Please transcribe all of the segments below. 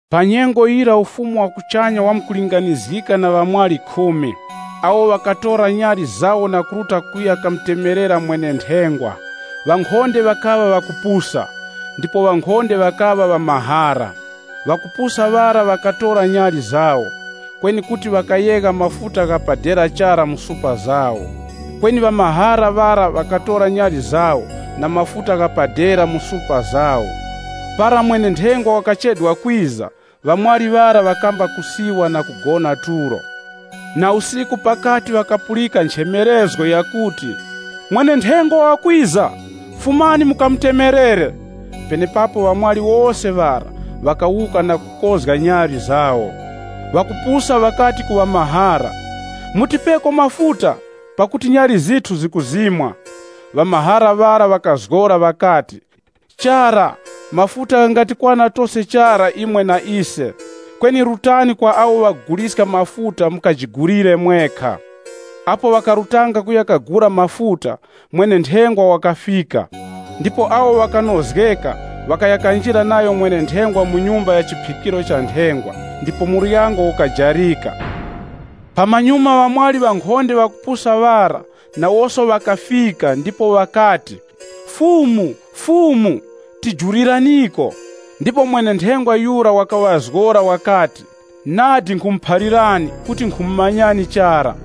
“Pa nyengo yira Ufumu wa kuchanya wamkulinganizgika na ŵamwali khumi, awo ŵakatora nyali zawo na kuruta kuya kamutemerera mwene-nthengwa. Ŵankhonde ŵakaŵa ŵakupusa, ndipo ŵankhonde ŵakaŵa ŵamahara. Ŵakupusa ŵara ŵakatora nyali zawo, kweni kuti ŵakayegha mafuta gha pa dera chara mu supa zawo. Kweni ŵamahara ŵara, ŵakatora nyali zawo na mafuta gha pa dera mu supa zawo. Para mwene-nthengwa wakachedwa kwiza, ŵamwali ŵara ŵakamba kusiwa na kugona tulo. “Na usiku pakati ŵakapulika nchemerezgo yakuti, ‘Mwene-nthengwa wakwiza! Fumani mukamutemerere.’ Penepapo ŵamwali wose ŵara, ŵakawuka na kukozga nyali zawo. Ŵakupusa ŵakati ku ŵamahara, ‘Mutipeko mafuta, pakuti nyali zithu zikuzimwa.’ Ŵamahara ŵara, ŵakazgora ŵakati, ‘Chara, mafuta ghangatikwana tose chara imwe na ise. Kweni rutani kwa awo ŵakuguliska mafuta mukajigulire mwekha.’ Apo ŵakarutanga kuya kagula mafuta, mwene-nthengwa wakafika. Ndipo awo ŵakaŵa ŵakunozgeka ŵakaya kanjira nayo mwene-nthengwa mu nyumba ya chiphikiro cha nthengwa, ndipo muryango ukajarika. “Pamanyuma ŵamwali ŵankhonde ŵakupusa ŵara, nawoso ŵakafika ndipo ŵakati, ‘Fumu, Fumu, tijuliraniko!’ Kweni mwene-nthengwa yura wakaŵazgora wakati, ‘Nadi nkhumuphalirani kuti nkhumumanyani chara!’”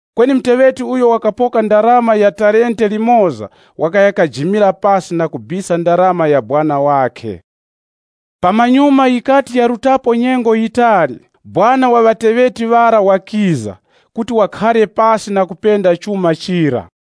Kweni muteŵeti uyo wakapoka ndarama ya talente limoza wakaya kajimira pasi na kubisa ndarama ya sekuru wakhe. “Pamanyuma yikati yarutapo nyengo yitali, sekuru wa ŵateŵeti ŵara wakiza, kuti wakhare pasi na kupenda chuma chira.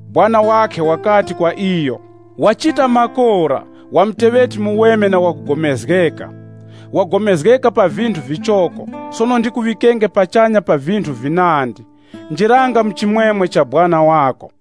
Sekuru wakhe wakati kwa iyo, ‘Wachita makora, wa muteŵeti muweme na wakugomezgeka. Wagomezgeka pa vinthu vichoko, sono ndikuŵikenge pachanya pa vinthu vinandi. Njiranga mu chimwemwe cha sekuru wako.’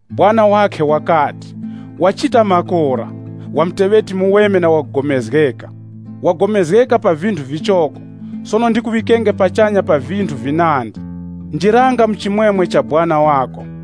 Sekuru wakhe wakati, ‘Wachita makora, wa muteŵeti muweme na wakugomezgeka. Wagomezgeka pa vinthu vichoko, sono ndikuŵikenge pachanya pa vinthu vinandi. Njiranga mu chimwemwe cha sekuru wako.’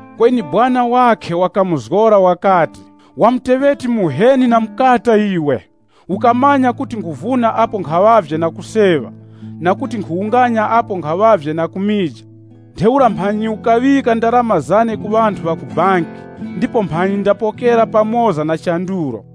Kweni sekuru wakhe wakamuzgora wakati, ‘Wa muteŵeti muheni na mukata iwe! Ukamanya kuti nkhuvuna apo nkhaŵavye na kuseŵa na kuti nkhuwunganya apo nkhaŵavye na kumija? Ntheura mphanyi ukaŵika ndarama zane ku ŵanthu ŵa ku banki, ndipo mphanyi ndapokera pamoza na chandulo.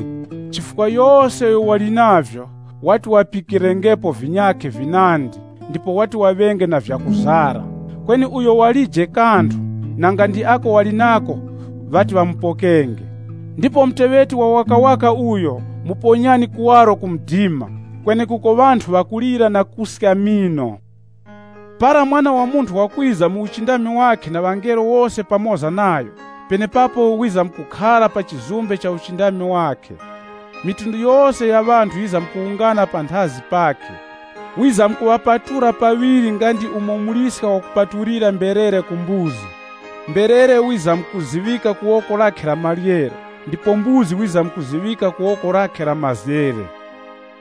Chifukwa yose uyo wali navyo wati ŵapikirengepo vinyakhe vinandi ndipo wati waŵenge na vyakuzara. Kweni uyo walije kanthu, nanga ndi ako wali nako ŵati ŵamupokenge. Ndipo muteŵeti wawakawaka uyo muponyani kuwaro ku mdima, kwenekuko ŵanthu ŵakulira na kuska mino.’ “Para Mwana wa Munthu wakwiza mu uchindami wakhe na ŵangelo wose, pamoza nayo, penepapo wizamkukhara pa chizumbe cha uchindami wakhe. Mafuko ghose gha ŵanthu ghizamkuwungana panthazi pakhe. Wizamkuŵapatula paŵiri nga ndi umo muliska wakupatulira mberere ku mbuzi. Mberere wizamkuziŵika ku woko lakhe la maryero, ndipo mbuzi wizamkuziŵika ku woko lakhe la mazere.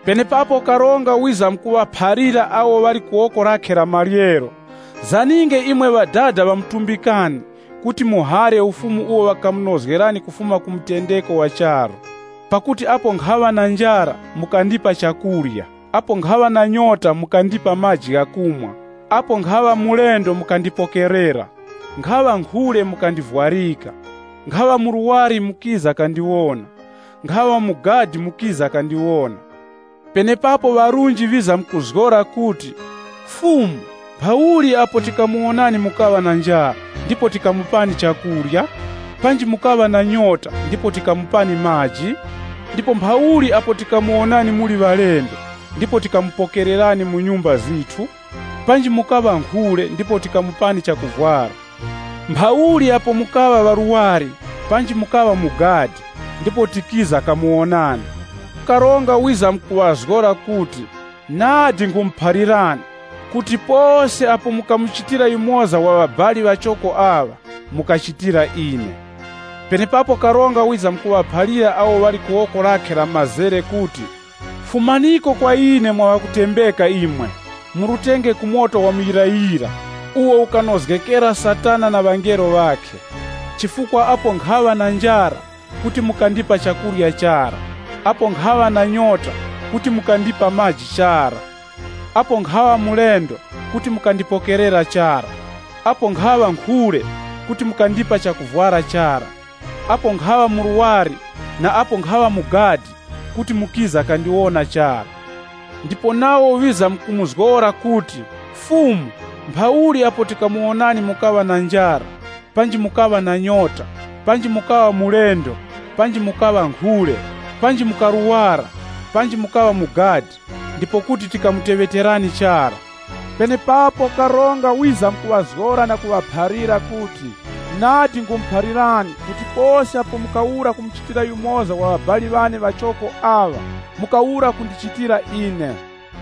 Penepapo karonga wizamkuŵaphalira awo ŵali ku woko lakhe la maryero, ‘Zaninge imwe Ŵadada ŵamutumbikani kuti muhare Ufumu uwo ŵakamunozgerani kufuma ku mutendeko wa charu. Pakuti apo nkhaŵa na njara, mukandipa chakurya, apo nkhaŵa na nyota, mukandipa maji ghakumwa, apo nkhaŵa mulendo, mukandipokerera, nkhaŵa nkhule, mukandivwarika. Nkhaŵa murwari, mukiza kandichezgera. Nkhaŵa mu gadi, mukiza kandiwona.’ Penepapo ŵarunji ŵizamkuzgora kuti, ‘Fumu, mphauli apo tikamuwonani mukaŵa na njara, ndipo tikamupani chakurya? Panji mukaŵa na nyota, ndipo tikamupani maji? Ndipo mphauli apo tikamuwonani muli ŵalendo, ndipo tikamupokererani mu nyumba zithu? Panji mukaŵa nkhule ndipo tikamupani chakuvwara? Mphauli apo mukaŵa ŵarwari panji mukaŵa mu gadi, ndipo tikiza kamuwonani?’ Karonga wizamkuŵazgora kuti, ‘Nadi nkhumuphalirani kuti pose apo mukamuchitira yumoza wa ŵabali ŵachoko aŵa mukachitira ine.’ “Penepapo karonga wizamkuŵaphalira awo ŵali ku woko lakhe la mazere kuti, ‘Fumaniko kwa ine mwaŵakutembeka imwe, murutenge ku moto wa muyirayira uwo ukanozgekera Satana na ŵangelo ŵakhe. Chifukwa apo nkhaŵa na njara, kuti mukandipa chakurya chara, apo nkhaŵa na nyota, kuti mukandipa maji chara. Apo nkhaŵa mulendo, kuti mukandipokerera chara. Apo nkhaŵa nkhule, kuti mukandipa chakuvwara chara. Apo nkhaŵa murwari na apo nkhaŵa mu gadi, kuti mukiza kandiwona chara.’ Ndipo nawo ŵizamkumuzgora kuti, ‘Fumu, mphauli apo tikamuwonani mukaŵa na njara, panji mukaŵa na nyota, panji mukaŵa mulendo panji mukaŵa nkhule, panji mukarwara, panji mukaŵa mu gadi, ndipo kuti tikamuteŵeterani chara?’ Penepapo karonga wizamkuŵazgora na kuŵaphalira kuti, ‘Nadi nkhumuphalirani kuti pose apo mukawura kumuchitira yumoza wa ŵabali ŵane ŵachoko aŵa, mukawura kundichitira ine.’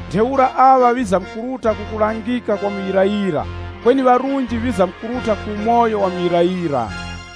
Ntheura aŵa ŵizamkuruta ku kulangika kwa muyirayira, kweni ŵarunji ŵizamkuruta ku umoyo wa muyirayira.”